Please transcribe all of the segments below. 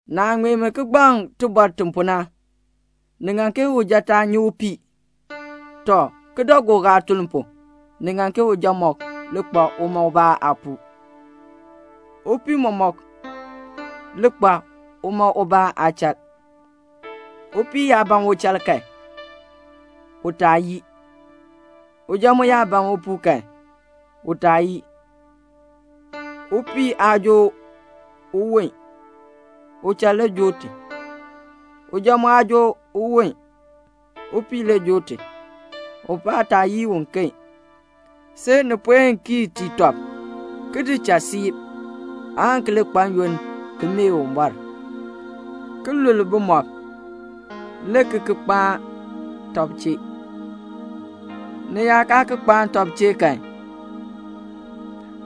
Naah ŋmee mi kigbaŋ tibɔr ti pu na, ni ŋan ke uja taa nyi upii. Tɔ, kidaagook aatuln pu, ni ŋan ke uja mɔmɔk li kpa uma ubaa aapuu, upii mɔmɔk li kpa uma ubaa aachal. Upii yaa ban uchal kan, u taa yii, uja mu yaa ban upuu kan, u taa yii. Upii aa joo uwon, uchal le joo ti. Uja mu aa joo uwon, upii le joo ti. Ubaa taa yii uken, see ni puen kii tii tɔb ki di cha siib, aan ki li kpa n-yoonn ki mee Uwumbɔr, [ki lul bumɔb,] le ki ki kpaan tɔb chee. Ni yaa kaa ki kpaan tɔb chee kan,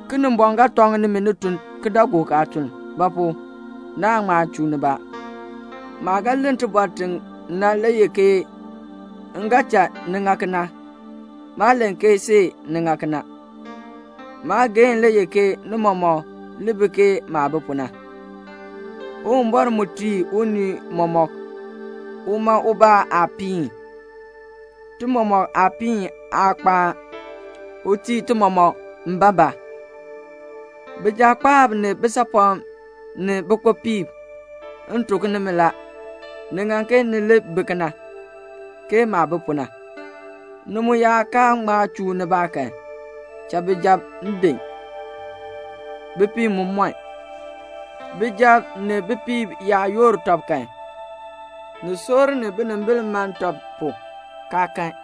Kinimbɔŋ ga tɔŋ nimi ni tun kidaagook aatuln. Ba pu? naan ŋma chuu nibaa. Maah ga len tibɔr ti na le ye ke m ga cha ni ŋa kena, maa len ke see ni ŋa kena. Maageehn le ye ke ni mɔmɔk li bi ke maah bi pu na. Uwumbɔr mu tii unii mɔmɔk uma ubaa aapiin. Ti mɔmɔk aapiin aa kpaa. U tii ti mɔmɔk mbaabaa. Bijakpaab ni bisaapɔm ni bikpopiib, m tuk nimi la, ni ŋan ke ni li bi kena, ke maah bi pu na. Ni mu yaa kaa ŋma chuu nibaa kan, cha bijab din, bipiib mu mɔn. Bijab ni bipiib yaa yoor tɔb kan, ni soor ni binimbil man tɔb pu, kaa kan.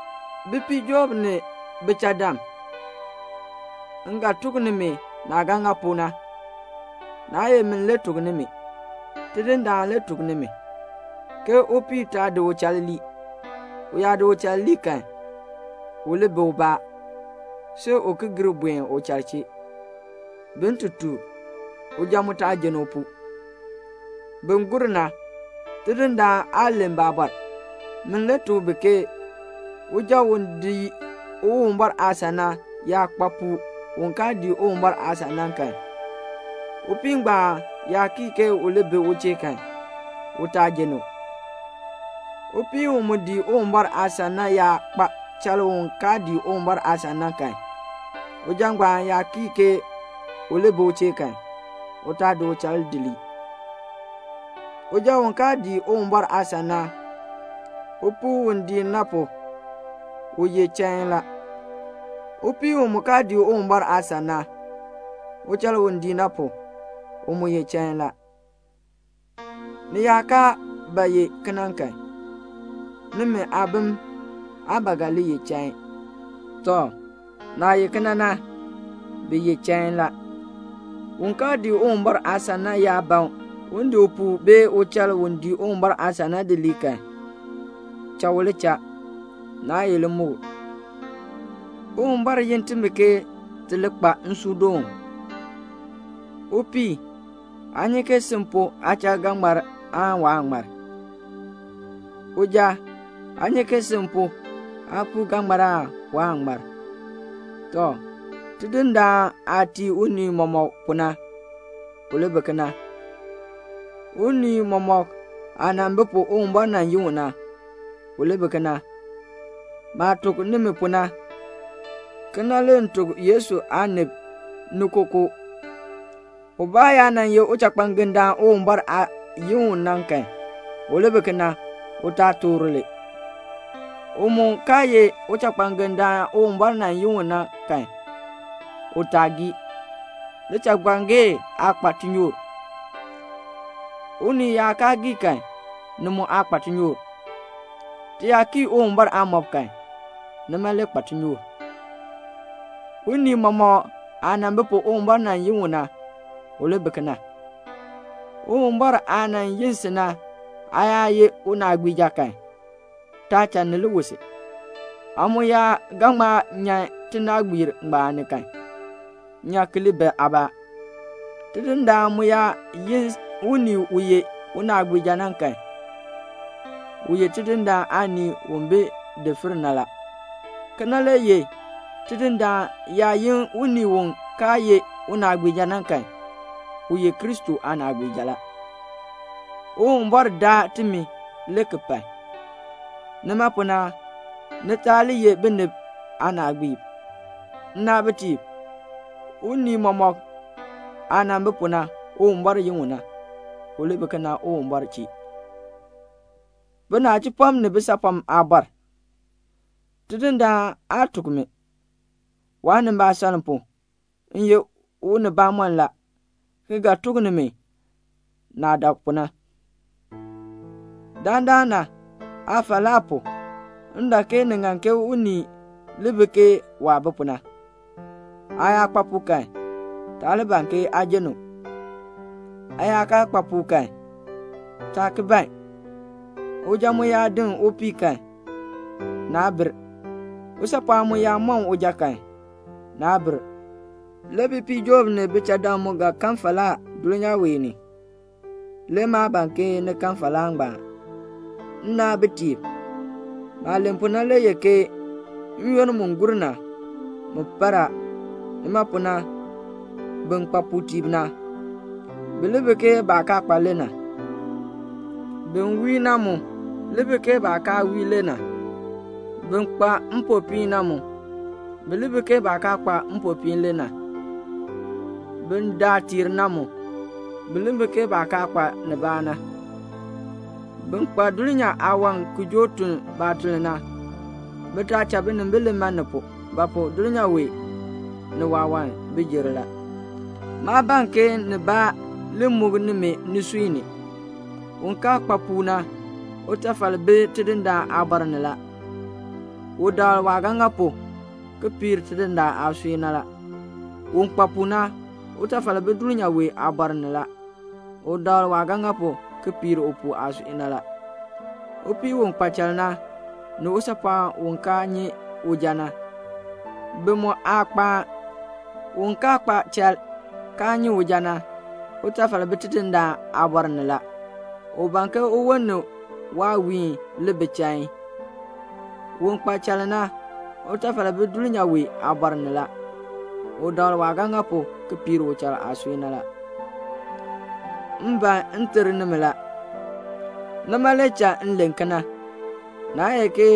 Bipiijoob ni bichadam, m ga tuk nimi naah ga ŋa pu na, naa ye min le tuk nimi, Tidindaan le tuk nimi, ke upii taa di uchal lii. U yaa di uchal lii kan, u li bi ubaa, see u ki gir buen uchal chee, bin ti took. Uja mu taa jenn upuu. Bin gur na, Tidindaan aa len baabɔr. Min le tuk bi ke uja u dii Uwumbɔr aasan na yaa kpa puu u kaa dii Uwumbɔr aasan na kan, upii ngbaan yaa kii ke u li bi u chee kan, u taa jenn u. Upii u mu dii Uwumbɔr aasan na yaa kpa chal u kaa dii Uwumbɔr aasan na kan, uja ngbaan yaa kii ke u li bi u chee kan, u taa di uchal di lii. Uja u kaa dii Uwumbɔr aasan na, upuu u dii na pu, u ye chain la. Upii u mu kaa dii Uwumbɔr aasan na, uchal u dii na pu, u mu ye chain la. Ni yaa kaa ba ye kena kan, nimi aabim aa ba ga li ye chain. Tɔ, naah ye kena na, bi ye chain la. Un kaa dii Uwumbɔr aasan na yaa ban un di upuu bee uchal u dii Uwumbɔr aasan na di lii kan, cha u li cha. Naa ye limukl. Uwumbɔr yin timi ke ti li kpa nsuudoon. Upii, aa nyi ke sin pu aachal ga ŋmar aan waan ŋmar? Uja, aa nyi ke sin pu aapuu ga ŋmar aan waan ŋmar? Tɔ, Tidindaan aah tii unii mɔmɔk pu na, u li bi kena. Unii mɔmɔk aah nan bi pu Uwumbɔr nan yin u na, u li bi kena. Maah tuk nimi pu na, kena le m tuk Yesu aanib ni kookoo. Ubaa yaa nan ye uchakpangendaan Uwumbɔr nan yin u na kan, u li bi kena, u taa toor li. U mu kaa ye uchakpangendaan Uwumbɔr nan yin u na kan, u taa ki gii. Lichakpangee aa kpa tinyoor. Unii yaa kaa gii kan, ni mu aa kpa tinyoor. Ti yaa kii Uwumbɔr aamɔb kan, nima le kpa tinyoor. Unii mɔmɔk aah nan bi pu Uwumbɔr nan yin u na, u li bi kena. Uwumbɔr aah nan yin si na, aa yaa ye unaagbiija kan, taa cha ni li wu si. Aa mu yaa ga ŋma nyan tinaagbiir ngbaan ni kan, nyan ki li bi aabaa. Tidindaan mu yaa yin unii u ye unaagbiija na kan, u ye Tidindaan aanii u bi daafir na la. Kena le ye Tidindaan yaa yin unii u kaa ye unaagbiija na kan, u ye Kristo aanaagbiija la. Uwumbɔr daa timi le ki pai. Nima pu na, ni taa li ye binib aanaagbiib. Nnaabitiib, unii mɔmɔk aah nan bi pu Uwumbɔr nan yin u na, u li bi kena Uwumbɔr chee. Binachipɔm ni bisaapɔm aabɔr, Tidindaan aa tuk mi; waanimbaasaln pu, m ye unibamɔnn la, ki ga tuk nimi maah dak pu na. Dandana aafalaa pu, m dak ke ni ŋan ke unii li bi ke waah bi pu na. Aa yaa kpa puu kan, taa li ban ke aa jenn u. Aa yaa kaa kpa puu kan, taa ki ban. Uja mu yaa din upii kan, naa bir. Usaapɔɔn mu yaa mɔn uja kan, naa bir. Le bipiijoob ni bichadam mu ga kan falaa dulnyaa wee ni. Le maa ban ke ni kan falaa ngbaan. Nnaabitiib, maah len pu na le ye ke n-yoonn mu gur na, mu par a. Nima pu na, bin kpa puutiib na, bi li bi ke baah kaa kpa le na; bin wii na mu li bi ke baah kaa wii le na, bin kpa mpopiin na mu, bi li bi ke baah kaa kpa mpopiin le na, bin daa tiir na mu, bi li bi ke baah kaa kpa nibaa na. Bin kpa dulnyaa aawan ki joo tun baatuln na, bi taa cha binimbil li man ni pu; ba pu? dulnyaa wee, ni waawan bi jer la. Maa ban ke nibaa li muk nimi nisui ni. Un kaa kpa puu na, utafal bi Tidindaan aabɔr ni la. U dakl waah ga ŋa pu ki piir Tidindaan aasui na la. Un kpa puu na, utafal bi dulnyaa wee aabɔr ni la, u dakl waah ga ŋa pu ki piir upuu aasui na la. Upii u kpa chal na, ni usaapɔɔn u kaa nyi uja na, bi mu aa kpaa. Un kaa kpa chal kaa nyi uja na, utafal bi Tidindaan aabɔr ni la; u ban ke uwon ni waawiin li bi chain. Un kpa chal na, utafal bi dulnyaa wee aabɔr ni la, u dakl waah ga ŋa pu ki piir uchal aasui na la. M ban m ter nimi la. Nima le cha m len kena. Naa ye ke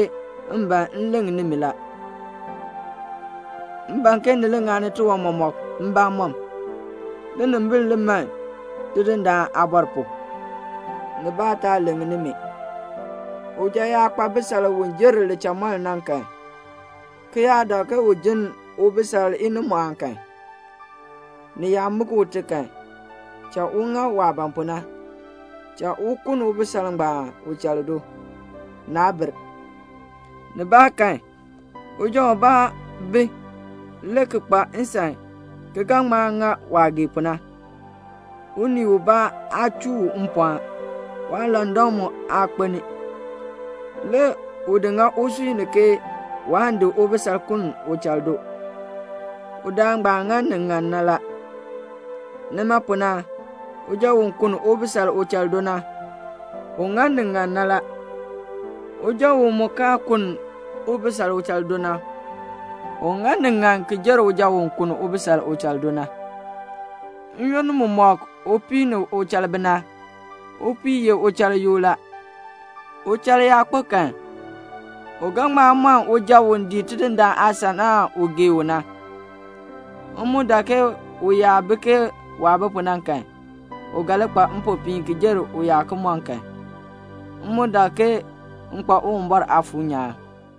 m ban m leŋ nimi la. M ban ke ni li ŋani tiwan mɔmɔk mbamɔm, ninimbil li man Tidindaan aabɔr pu, nibaa taa leŋ nimi. Uja yaa kpa bisal u jer lichamɔln na kan, ki yaa dak ke u jinn ubisal inimɔɔn kan, ni yaa muk ute kan, cha u ŋa waah ban pu na, cha u kunn ubisal ngbaan uchal do. Naa bir. Nibaakan uja ubaa bi le ki kpa nsan ki ga ŋma ŋa waah gee pu na, unii ubaa aa chuu u mpɔɔn, waalandak mu aa kpelni, le u di ŋa usui ni ke waan di ubisal kunn uchal do, udaan ngbaan ŋa ni ŋan la. Nima pu na, uja u kunn ubisal uchal do na, u ŋa ni ŋan la. Uja mu u kaa kunn ubisal uchal do na, u ŋa ni ŋan ki jer uja u kunn ubisal uchal do na. N-yoonn mumɔk upii ni uchal bi na, upii ye uchal yoo la. Uchal yaa kpo kan u ga ŋma mɔn uja u dii Tidindaan aasan na u waah gee u na. M mu dak ke u yaa bi ke waah bi pu na kan, u ga li kpa mpopiin ki jer u yaa ki mɔn kan. M mu dak ke m kpa Uwumbɔr Aafuur nyaan.